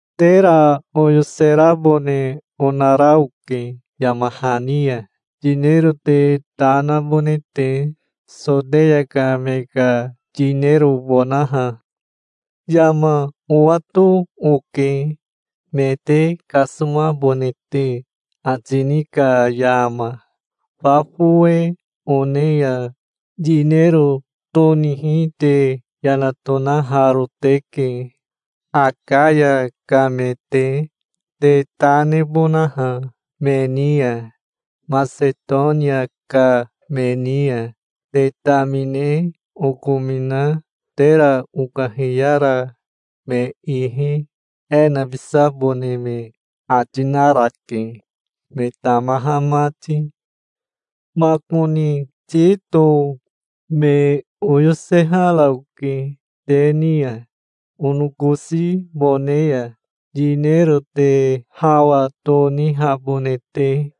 Tera oyoserabone onara oke yama hani ya, yinero te ta nabone te, Soteya ka me ka yinerobonaha. Yama owato oke, me te kasomabone te ati ni ka yama. Fa fowe one ya yinero tonihi te yana tonaharo teke, Akaya ka me te, te ta nebonaha me ni ya. Masetonia ka me ni ya te tamine okomina tera okahiyara me ihi e nabisabone me ati narake, me tamaha mati. Makoni Tito me oyosehara oke te ni ya, onokosibone ya, yinero te hawa tonihabone te.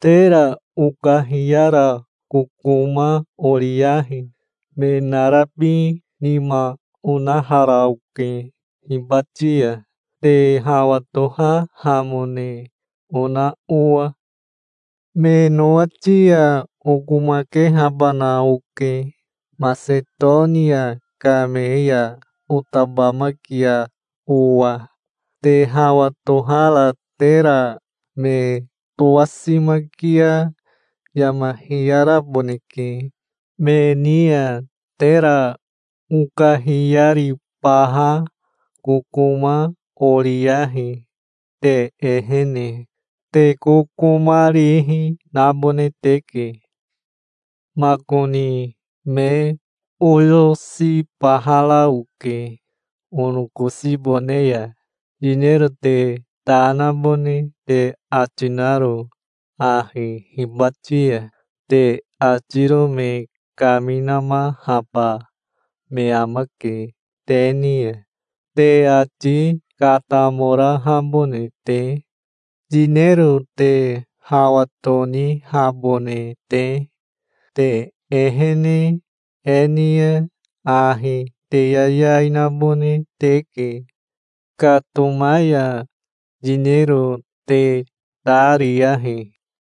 Tera okahiyara kokoma oriyahi. Me narabi nima onahara oke hibati ya, te hawa tohahamone ona owa. Me nowati ya okomakehabana oke, Masetonia ka me ya otabamakia owa. Te hawa tohara tera me towasimaki ya yama hiyaraboneke. Me ni ya tera okahiyaribaha kokoma oriyahi te ehene. Te kokomarihi nabone teke. Makoni me oyosibahara oke onokosibone ya. Yinero te ta nabone te ati naro ahi hibati ya te atiro me kaminamahaba me amake te ni ya, te ati katamorahabone te, yinero te hawa tonihabone te. Te ehene e ni ya ahi te yayai nabone teke. Katoma ya yinero te ta riyahi.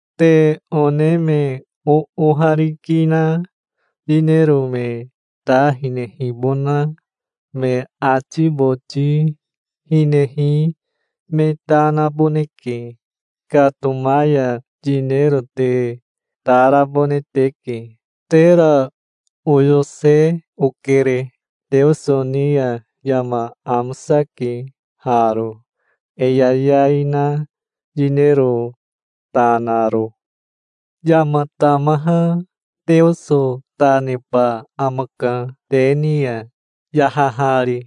Te one me oohariki na yinero me ta hinehibona me ati boti hinehi me ta naboneke. Katoma ya yinero te ta rabone teke. Tera oyose okere. Teoso ni ya yama amosake haro, e yayai na yinero ta naro. Yama tamaha Teoso ta neba amaka te ni ya, yahahari,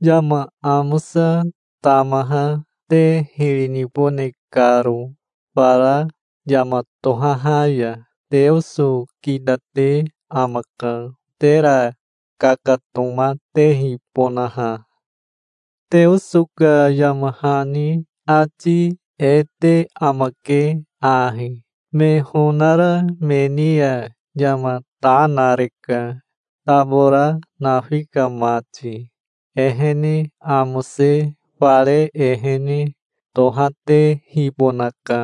yama amosa tamaha te hiri nibone karo fara yama tohaha ya. Teoso kitate amaka, tera kakatomatehibonaha. Teoso ka yama hani ati e te amake ahi: 'Me honara me ni ya yama ta nareka, tabora nafi ka mati. Ehene amose fare ehene tohatehibonaka',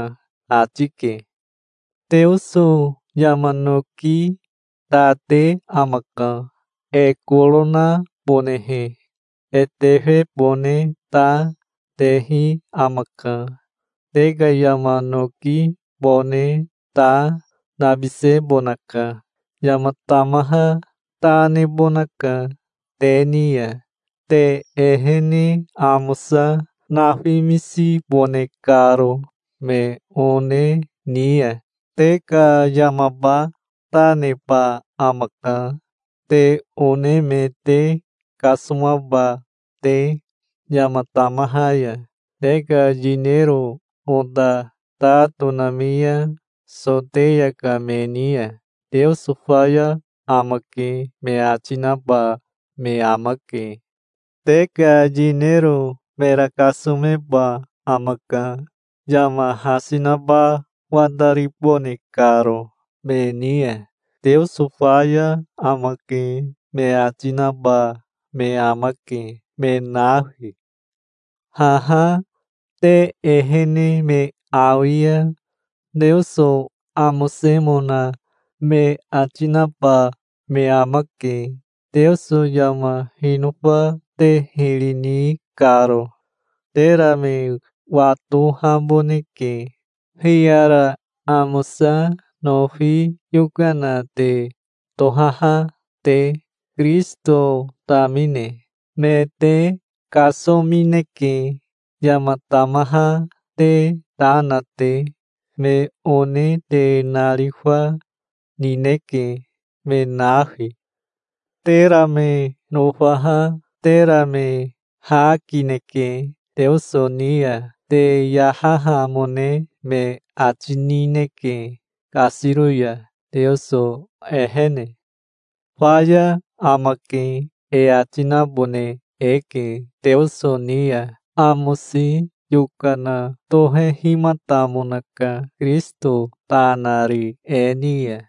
ati ke. Teoso yama noki ta te amaka, e koro nabonehe. E tefebone ta, tehi amaka. Te ka yama nokibone ta, nabisebonaka. Yama tamaha ta nebonaka te ni ya, te ehene amosa nafimisibone karo me one ni ya. Te ka yamaba ta neba amaka, te one me te kasomaba te yama tamaha ya. Te ka yinero ota ta tonami ya Soteya ka me ni ya, 'Teoso faya amake", me ati naba me amake. Te ka yinero mera kasomeba amaka, yama hasi naba wataribone karo me ni ya. "Teoso faya amake", me ati naba me amake, me nafi. Haha te ehene me awi ya Teoso amosemona me ati naba me amake, Teoso yama hinofa te hiri ni karo. Tera me watohaboneke, hiyara amosa nofi yokana te tohaha te, Kirisito tamine. Me te kasomineke, yama tamaha te ta na te. Me one te narifa nineke, me nafi. Tera me nofaha tera me ha kineke Teoso ni ya. Te yahahamone me ati nineke kasiro ya Teoso ehene. "Faya amake", e ati nabone eke Teoso ni ya. Amosi yokana tohehimatamonaka, Kirisito ta nari e ni ya.